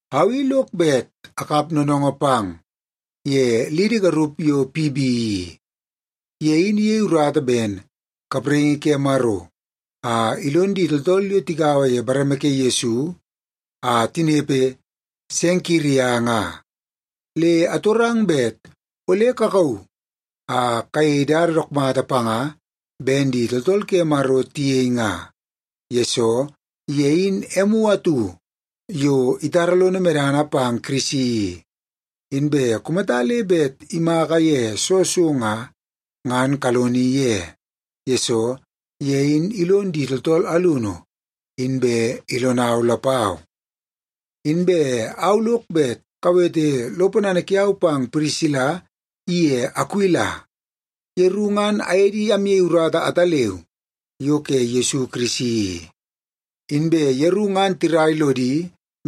Au i lok bet akap noonoongoo pang ye lidi garup yo Pibi i. Ye in iyei urata ben kapraingi ke Maro a ilon di tooltool yo tagaua ye bareme ke Yesu a tinepe Senkiria nga. Le atorang bet ole kakauu a kayei dada dook mata panga ben di tooltool ke Maro tiyei nga, yesoo ye in emu atu yo itara lono medana pang Kirisi i. Inbe kumata le bet imaka ye soo so nga, ngan kaloni ye, yesoo ye in ilon di tooltool alunu, inbe ilonau lapau. Inbe au lok bet kawete lo ponana kiau pang Pirisila iye Akuila. Yeru ngan aye di amyei urata ataleu yo ke Yesu Kirisi i. Inbe yeru ngan tirai lodi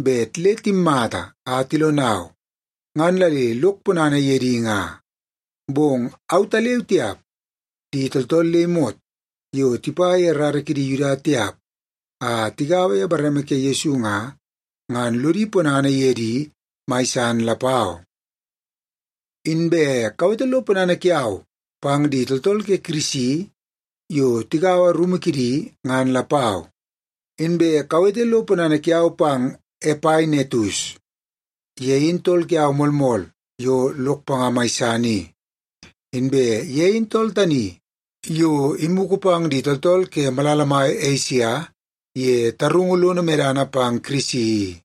bet le timmata a tilonau, ngan la le lok ponana ye di nga. Bong autaleu tiap, di tooltool le imot yo tipa ye rara kidi Yuda tiap a tigaua ye bareme ke Yesu nga, ngan lodi ponana ye di mai san lapau. Inbe kawete lo ponana kiau pang di tooltool ke Kirisi yo tigaua rumu kidi, ngan lapau. Inbe kawete lo ponana kiau pang Epainetus. Ye in tool kiau moolmool yo lok panga mai san i. Inbe ye in tool tani yo imugu pang di tooltool ke malala mai Esia ye tarungu lono medana pang Kirisi i.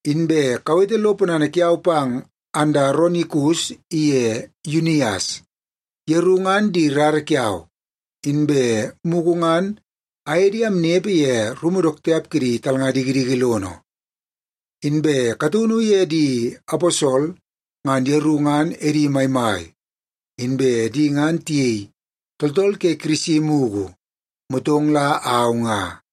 Inbe kawete lo ponana kiau pang Andaronikus iye Yunias. Yeru ngan di rara kiau, inbe mugu ngan aye di amnepe ye rumu dook tiap kidi talnga dikidiki lono. Inbe kataunu ye di aposol ngan yeru ngan edi maimai, inbe di ngan tiyei tooltool ke Kirisi mugu, motong la au nga.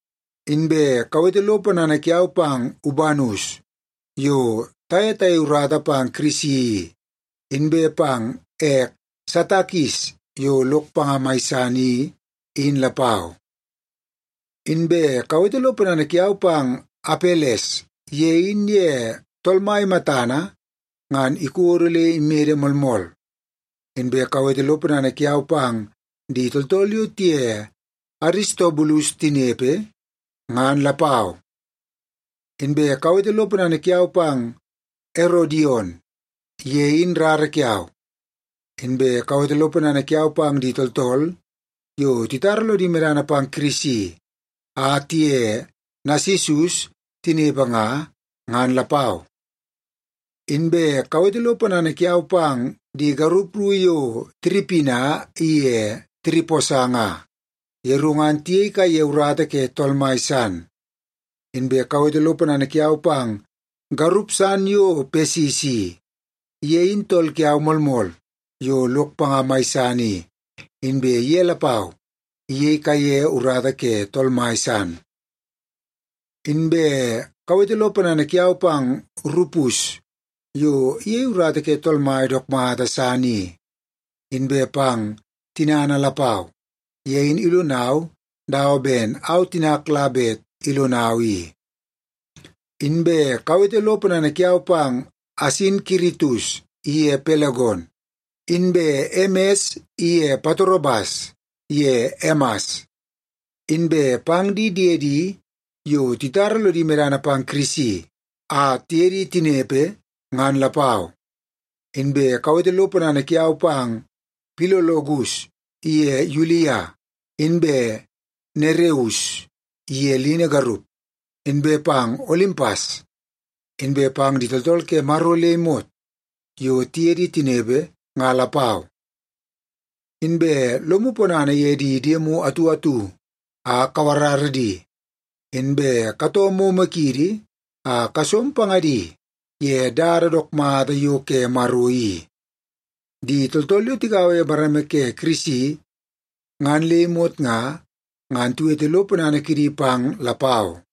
Inbe kawete lo ponana kiau pang Ubanus, yo taye tayei urata pang Kirisi i, inbe pang ek Satakis yo lok panga mai san i, in lapau. Inbe kawete lo ponana kiau pang Apeles, ye in ye Tool Mai matana ngan ikodo le imede moolmool. Inbe kawete lo ponana kiau pang di tooltool yo tiye Aristobulus tinepe, ngan lapau. Inbe kawete lo ponana kiau pang Erodion. Ye in rara kiau. Inbe kawete lo ponana kiau pang di tooltool yo titara lodi medana pang Kirisi a tiye Nasisus tinepe nga, ngan lapau. Inbe kawete lo ponana kiau pang di garup ru yo Tiripina iye Tiriposa nga. Yeru ngan tiyei kaiye urata ke Tool Mai san. Inbe kawete lo ponana kiau pang garup san yo Pesis i. Ye in tool kiau moolmool yo lok panga mai san i, inbe ye lapau iyei kaiye urata ke Tool Mai san. Inbe kawete lo ponana kiau pang Rupus yo iyei urata ke Tool Mai dook mata san i, inbe pang tinana lapau. Ye in ilonau dawa ben au tinak la bet ilonau i. Inbe kawete lo ponana kiau pang Asinkiritus iye Pelegon, inbe Emes iye Patrobas ye Emas, inbe pang di diedi yo titara lodi medana pang Kirisi a tiye di tinepe, ngan lapau. Inbe kawete lo ponana kiau pang Pilologus iye Yulia, inbe Nereus iye lini garup, inbe pang Olimpas, inbe pang di tooltool ke Maro le imot yo tiye di tinepe nga lapau. Inbe lomu ponana ye di diemu atu atu a kawarara di, inbe katoo momo kiidi a kasom pangadi ye dada dook mata yo ke Maro i. Di tooltool yo tigaua ye bareme ke Kirisi ngan le imot nga, ngan tiwete lo ponana kidi pang lapau.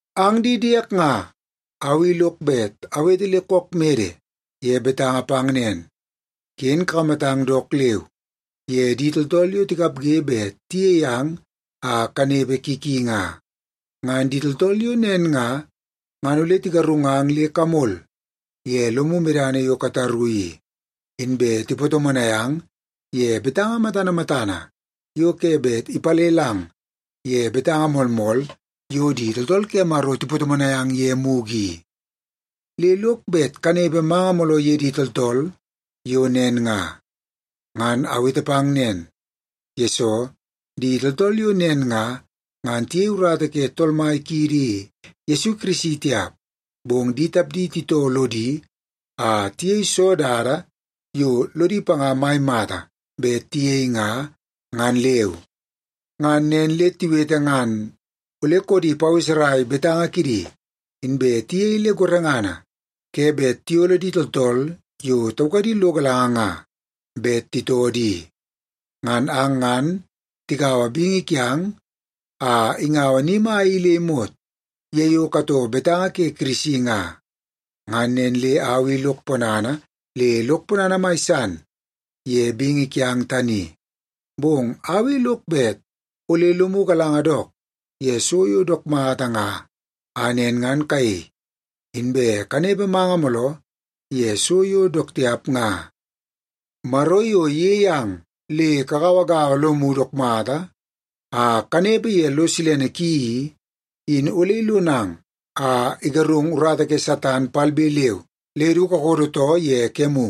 Ang di diek nga, au i lok bet awete le kook mede ye betanga pang nen, ken kakamatang dook leu ye di tooltool yo tikapge bet tiyei ang a kanepe ki ki nga. Ngan di tooltool yo nen nga, ngan ole tigarungang le kamol ye lomu medana yo kataru i, inbe tipatomonai ang ye betanga matana matana yo ke bet ipalelang ye betanga moolmool yo di tooltool ke Maro tipatomonai ang ye mugu i. Le lok bet kanepe manga mooloo ye di tooltool yo nen nga. Ngan awete pang nen, yesoo di tooltool yo nen nga, ngan tiyei urata ke Tool Mai kiidi Yesu Kirisi tiap, bong di tapdi titoo lodi a tiyei soo dada yo lodi panga mai mata bet tiyei nga, ngan leu. Ngan nen le tiwete ngan ole koodi paweserai betanga kidi, inbe tiyei le gorengana ke bet tiyolo di tooltool yo taukadi lo galanga nga bet titoo di. Ngan ang ngan tikaua bingi kiang a ingaua ni mai i le imot ye yo katoo betanga ke Kirisi nga. Ngan nen le au i lok ponana le lok ponana mai san ye bingi kiang tani. Bong au i lok bet ole lomu galanga dook ye so yo dook mata nga a nen ngan kayei, inbe kanepe manga mooloo ye so yo dook tiap nga. Maro yo iyei ang le kagauagaua lomu dook mata a kanepe ye lo silene ki i, in ole ilonang a igarungu urata ke Satan palbe leu le du kakodo too ye kemu.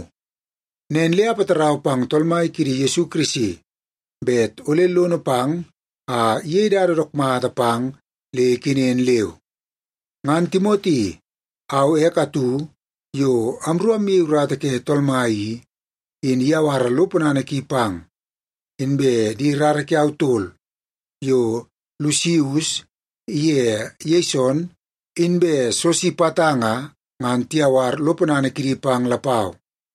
Nen le apatarau pang Tool Mai kiidi Yesu Kirisi bet ole lono pang a iyei dada dook mata pang le ikenen leu. Ngan Timoti, au ek atu yo amru amyei urata ke Tool Mai i, in iyawara lo ponana ki pang. Inbe di rara kiau tol yo Lusius iye Yeson inbe Sosipata nga, ngan tiyawar lo ponana kidi pang lapau.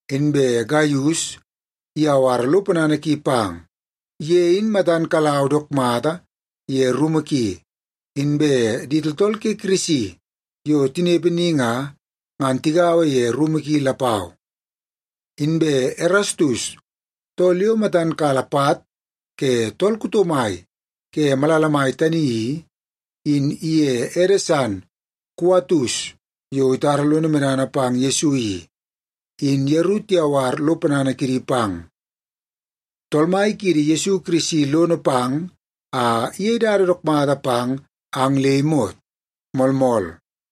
Inbe Gaius iyawara lo ponana ki pang. Ye in matan kalau dook mata ye rumu ki, inbe di tooltool ke Kirisi yo tinepe ni nga, ngan tigaua ye rumu ki lapau. Inbe Erastus, tool yo matan kala pat ke tool kuto mai ke malala mai tani i, in iye ede san Kuatus, yo itara lono medana pang Yesu i, in yeru tiyawar lo ponana kidi pang. Tool Mai kiidi Yesu Kirisi lono pang a iyei dada dook mata pang ang le imot. Moolmool.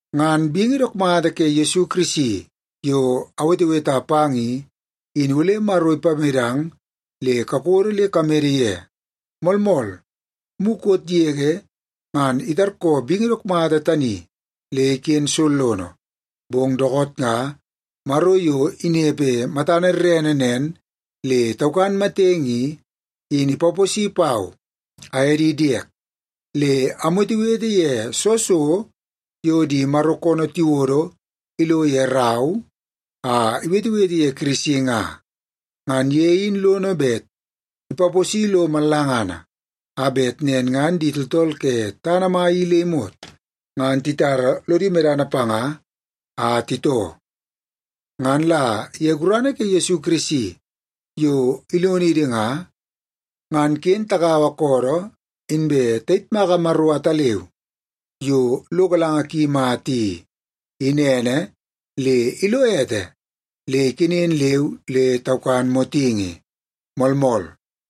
Ngan bingi dook mata ke Yesu Kirisi yo aweteweta pang i, in ole Maro ipamedang le kakodo le kamede ye. Moolmool, mukot yege ngan itarkoo bingi dook mata tani le iken sollono, bong dookoot nga, Maro yo inepe matana rerene nen le taukan matenge i, in ipaposi pau aye di diek, le amwetewete ye soo so di Maro koonoo tiwodo ilo ye rau a iwetewete ye Kirisi nga. Ngan ye in lono bet ipaposi lo mallangana, a bet nen ngan di tooltool ke tana mai i le imot ngan titara lodi medana panga a titoo. Ngan la ye gurana ke Yesu Kirisi yo ilonidi nga, ngan ken tagaua koodoo inbe tayitmaka Maro ataleu yo lo galanga ki mata i, in ene, le ilo ete le ikenen leu le taukan motingi. Moolmool.